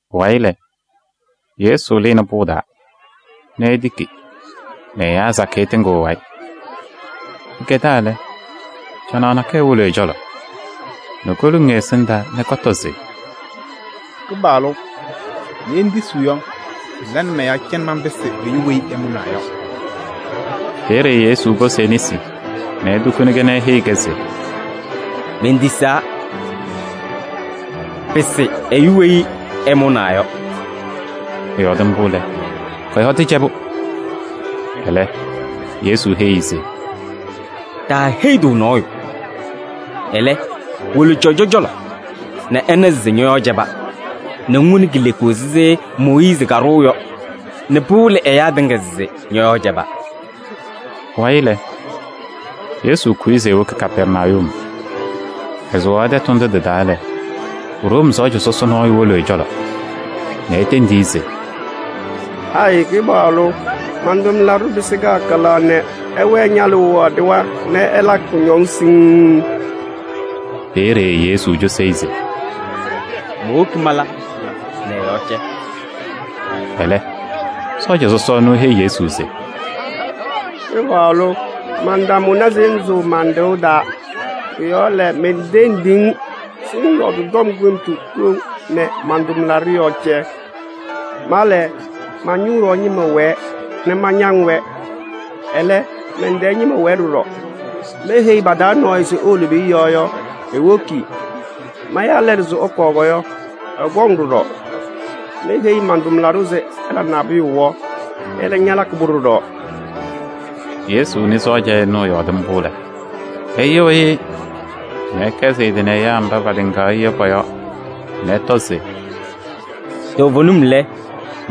Pʋwayɩ lɛ, Yesu lɩnɩ pʋʋ taa nɛ etiki nɛ ɛyaa sakɩyɛ tɩŋɩɣ ɛ-wayɩ. Pɩkɛdaa lɛ, canaɣ nakɛyɛ wolo ɛ-cɔlɔ nɛ koluŋ ɛ-ɛsɩndaa nɛ kɔtɔ se: “Kɩpaɣlʋ! Ye ŋtisiɣ yɔ, ŋla nɛ mɔ-yɔɔ cɛ nɛ manpɩsɩ ɛyʋ weyi ɛmʋnaa yɔ.” Peeye Yesu posi e-nesi nɛ etukuni-kɛ nɛ eheyi-kɛ se: “Mentisaa! Pɩsɩ ɛyʋ weyi ɛmʋnaa yɔ.” Ɛyɔɔdɩ mbʋ lɛ, kɔ-yɔɔ tɩcɛbʋ. Ɛlɛ Yesu heyi-i se: “Taaheyi-tʋ nɔɔyʋ. Ɛlɛ, wolo cɔjɔ cɔlɔ nɛ ɛna se ñɔ-yɔɔ cɛba, nɛ ŋwoni kileku ɛzɩ Mooyiizi kaɖʋʋ yɔ nɛ pɩwɩlɩ ɛyaa tɩŋa se ñɔ-yɔɔ cɛba.” Pʋwayɩ lɛ, Yesu kʋyɩ se ewoki Kapɛrnayum. Ɛsʋwaɣ tɛtʋ ndʋ tɩ-taa lɛ, Room sɔɔja sɔsɔ nɔɔyʋ wolo ɛ-cɔlɔ nɛ etendi-i se: “Hayɩ Kɩpaɣlʋ! Man-tʋmlaɖʋ pɩsɩ kalɩkalaɣ nɛ ɛwɛɛ ñalʋʋ yɔɔ ɖɩɣa nɛ ɛlakɩ kʋñɔŋ siŋŋ.” Peeye Yesu cosi-i se: “Mowoki mala nɛ ɛ-yɔɔ cɛ.” Ɛlɛ, sɔɔja sɔsɔ ɛnʋ eheyi Yesu se: “Kɩpaɣlʋ! Mantamʋna se ŋsʋʋ man-ɖɩɣa taa. Pʋ-yɔɔ lɛ, mentendiɣ-ŋ se ŋyɔɔdɩ tɔm kʋɖʋmtʋ koŋ nɛ man-tʋmlaɖʋ yɔɔ cɛ. Ma lɛ, ma-ñʋʋ yɔɔ ñɩma wɛɛ nɛ mañaŋ-wɛ. Ɛlɛ, mɛn-tɛɛ ñɩma wɛɛ ɖɔɖɔ. Meheyi pa-taa nɔɔyʋ se ewolo peeye yɔ yɔ, ewoki. Maya lɛlʋ se ɛkɔɔ yɔ, ɛkɔŋ ɖɔɖɔ. Meheyi man-tʋmlaɖʋ se ɛla nabʋyʋ yɔ, ɛlɛ ñalakɩ-pʋ ɖɔɖɔ.” Yesu nɩ sɔɔja ɛnʋ ɛyɔɔdɩ mbʋ lɛ, ɛyɩɣyɩ-ɩ nɛ ɛkɛzɩ ɛ-tɩ nɛ ɛyaa mba patɩŋaɣ-ɩ yɔ pɔ-yɔɔ nɛ ɛtɔ se: “Toovenim lɛ,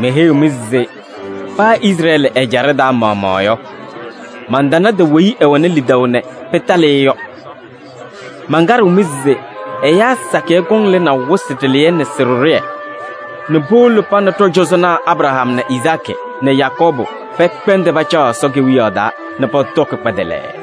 meheyiɣ-mɩ se paa Izrɛɛlɩ ɛjaɖɛ taa maɣmaɣ yɔ, mantanadɩ weyi ɛwɛnɩ lidaʋ nɛ pɩtalɩ-ɩ yɔ. Mankaɖɩɣ-mɩ se ɛyaa sakɩyɛ kɔŋ lɩnaʋ wɩsɩ ɖɩlɩyɛ nɛ sɩ-ɖɩɖʋyɛ nɛ powolo pa nɛ ɖɔ-cɔzɔnaa Abraham nɛ Izaakɩ nɛ Yakɔɔbʋ pɛkpɛndɩ pacaɣ Ɛsɔ Kewiyaɣ taa nɛ pɔtɔkɩ kpɛdɛlɛɛ.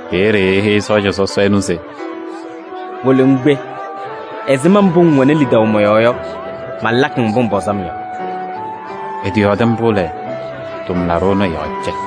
Peeye eheyi sɔɔja sɔsɔ ɛnʋ se: “Wolo ŋkpe. Ɛzɩma mbʋ ŋwɛnɩ lidaʋ mɔ-yɔɔ yɔ, malakɩ-ŋ mbʋ ŋpɔzɩ-m yɔ.” Ɛtɩyɔɔdɩ mbʋ lɛ, tʋmlaɖʋ ɛnʋ ɛ-yɔɔ cɛ.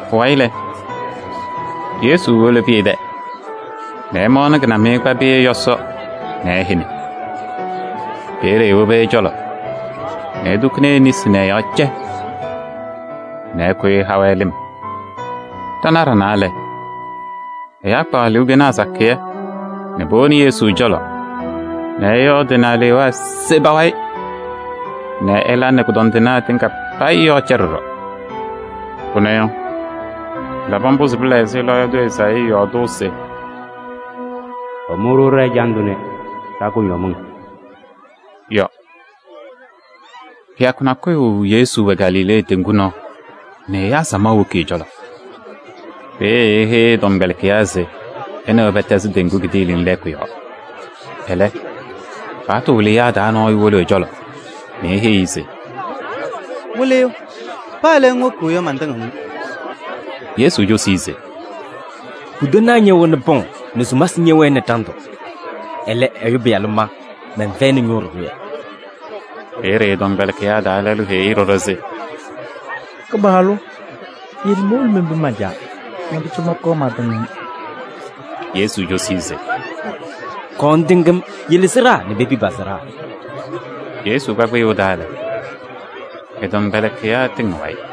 Pʋwayɩ lɛ, Yesu wolo Pɩyɛ tɛ nɛ ɛmaɣnɩ kɩnamɩyɛ kpa Pɩyɛ yɔsɔ nɛ ɛhɛnɩ. Peeye ewobi ɛ-cɔlɔ nɛ etukuni e-nesi nɛ ɛ-yɔɔ cɛ nɛ ɛkʋyɩ ɛha-wɛ lɩm. Ɖanaɣ ɖanaa lɛ, ɛyaa kpaɣ aluukenaa sakɩyɛ nɛ powoni Yesu cɔlɔ nɛ ɛyɔɔdɩ nɛ alewaa se pa-wayɩ nɛ ɛla nɛ kʋdɔndɩnaa tɩŋa payɩ yɔɔ cɛ ɖɔɖɔ. Pʋnɛ yɔ, pɩlabɩ mbʋ se pɩla ɛzɩ lɔɔyaɣ tʋ Ezaayii yɔɔdʋʋ se: “Ɛmʋ-ɖʋ ɖɛ-ɛjandʋ nɛ ɖa-kʋdɔmɩŋ” yɔ. Kɩyakʋ nakʋyʋ Yesu wɛ Galilee teŋgu nɔɔ nɛ ɛyaa samaɣ woki ɛ-cɔlɔ. Peeye eheyi ɛ-tɔmkpɛlɩkɩyaa se ɛ nɛ wɛ pɛtɛzɩ teŋgu kidiiliŋ lɛɛkʋ yɔɔ. Ɛlɛ, paɣtʋ wɩlɩyaa taa nɔɔyʋ wolo ɛ-cɔlɔ nɛ eheyiɣ-i se: “Wɩlɩyʋ! Paa le ŋwoki yɔ, mantɩŋɩɣ-ŋ.” Yesu cosi-i se: “Putanaa ñɛwɛnɩ pɔŋ nɛ sumasɩ ñɛwɛnɩ ɖandʋ. Ɛlɛ, Ɛyʋ Pɩyalʋ ma mɛnfɛyɩnɩ ñʋʋ ɖɩɖʋyɛ.” Peeye ɛ-tɔmkpɛlɩkɩyaa taa lɛlʋ heyi-i ɖɔɖɔ se: “Kɩpaɣlʋ! Yele mowolo menpi man-caa nɛ pʋcɔ mɔnkɔɔ mantɩŋ-ŋ.” Yesu cosi-i se: “Kɔɔ ŋtɩŋ-m, yele sɩɖaa nɛ pepi pa-sɩɖaa.” Yesu kpa kpɩyʋʋ taa lɛ, ɛ-tɔmkpɛlɩkɩyaa tɩŋ ɛ-wayɩ.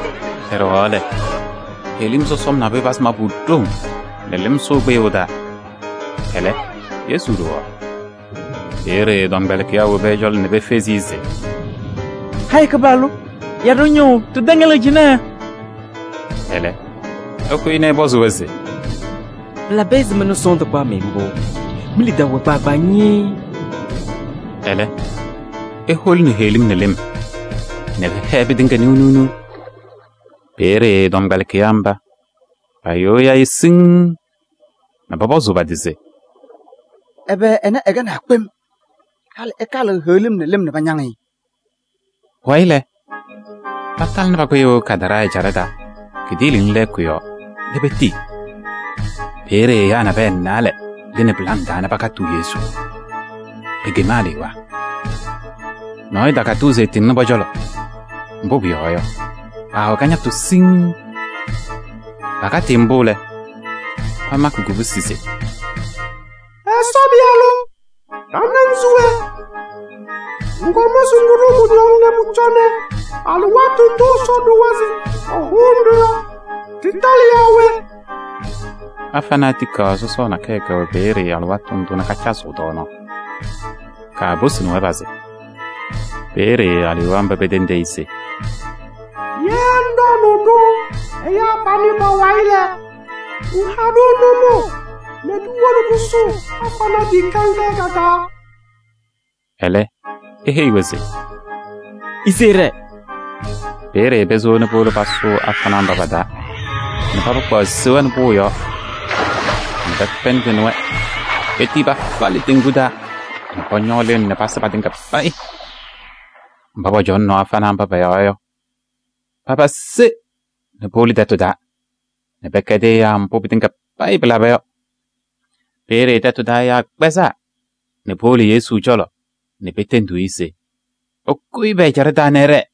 Pɛɖɛɣaɣ lɛ, heɣlim sɔsɔm nabʋyʋ pazɩ mabʋ ɖoŋ nɛ lɩm sʋʋ kpɩyʋʋ taa. Ɛlɛ, Yesu ɖowaɣ. Peeye ɛ-tɔmkpɛlɩkɩyaa wobi ɛ-cɔlɔ nɛ pefezi-i se: “Hayɩ Kɩpaɣlʋ! Ya ɖa-ñʋʋ! Ɖɩtɛŋɛlɩɣ cɩnɛ!” Ɛlɛ, ɛkʋyɩ nɛ ɛpɔzɩ-wɛ se: “Pɩlabɩ ɛzɩma nɛ sɔɔndʋ kpaɣ-mɩ mbʋ? Mi-lidaʋ wɛ kpaagbaa ñɩɩɩ!” Ɛlɛ eholini heɣlim nɛ lɩm nɛ pɩhɛɛ pɩtɩŋa niɣ niɣ. Peeye ɛ-tɔmkpɛlɩkɩyaa mba payɩɣyɩ-ɩ siŋŋ nɛ pɔpɔzʋʋ pa-tɩ se: “Ɛbɛ ɛnɛ ɛkɛnaa kpem nɛ pɩkpɛndɩnɩ heɣlim nɛ lɩm nɛ pañaŋ-ɩ?” Pʋwayɩ lɛ, patalɩnɩ pa-kpɩyʋʋ Gadaraa ɛjaɖɛ taa kidiiliŋ lɛɛkʋ yɔɔ nɛ petii. Peeye ɛyaa naalɛ nabɛyɛ lɩnɩ pɩlaŋ taa nɛ pakatɩɣ Yesu. Pekem alewaa. Nɔɔyʋ takatɩɣ se ɛtɩŋnɩ pɔ-cɔlɔ, mbʋ pʋyɔɔ yɔ, paawɛ kañatʋ siŋŋ. Pakatɩ-ɩ mbʋ lɛ, pamakɩ kubusi se: “Ɛsɔ Pɩyalʋ! Ɖa nɛ ŋ se we? Ŋkɔm se ŋɖʋ-ɖʋ kʋñɔŋ nɛ pʋcɔ alɩwaatʋ ndʋ Ɛsɔ ɖʋwa se ɛhʋʋnɩ-ɖʋ yɔ tɩtalɩ yaa we?” Afanaa tikaɣ sɔsɔɔ nakɛyɛ kɛwɛ peeye alɩwaatʋ ndʋ nɛ kacazɩɣ tɔɔnaɣ. Kaaposini-wɛ pazɩ. Peeye alewaa mba petendi-i se: “Ye ŋɖɔɔnʋʋ-ɖʋ ɛyaa panɛ pa-wayɩ lɛ, ŋha-ɖʋ nʋmɔʋ nɛ ɖiwolo ɖɩsʋʋ afanaa tikaɣ ŋga yɔ ka-taa.” Ɛlɛ eheyi-wɛ se: “Ise ɩɖɛɛ!” Peeye pesewa nɛ powolo pasʋʋ afanaa mba pa-taa nɛ paba kpaɣ seya nɛ pʋʋ yɔɔ nɛ pɛkpɛndɩnɩ-wɛ petii pafalɩ teŋgu taa nɛ pɔñɔɔ lɩm nɛ pasɩ patɩŋa payɩ. Mba pɔcɔŋaɣnɩ afanaa mba pɔ-yɔɔ yɔ, paba se nɛ powolo tɛtʋ taa nɛ pɛkɛdɩ ɛyaa mbʋ pɩtɩŋa payɩ pɩlaba yɔ. Peeye tɛtʋ taa ɛyaa kpɛzaa nɛ powolo Yesu cɔlɔ nɛ petendiɣ-i se ɛkʋyɩ pɛ-ɛjaɖɛ taa nɛ ɛɖɛɛ.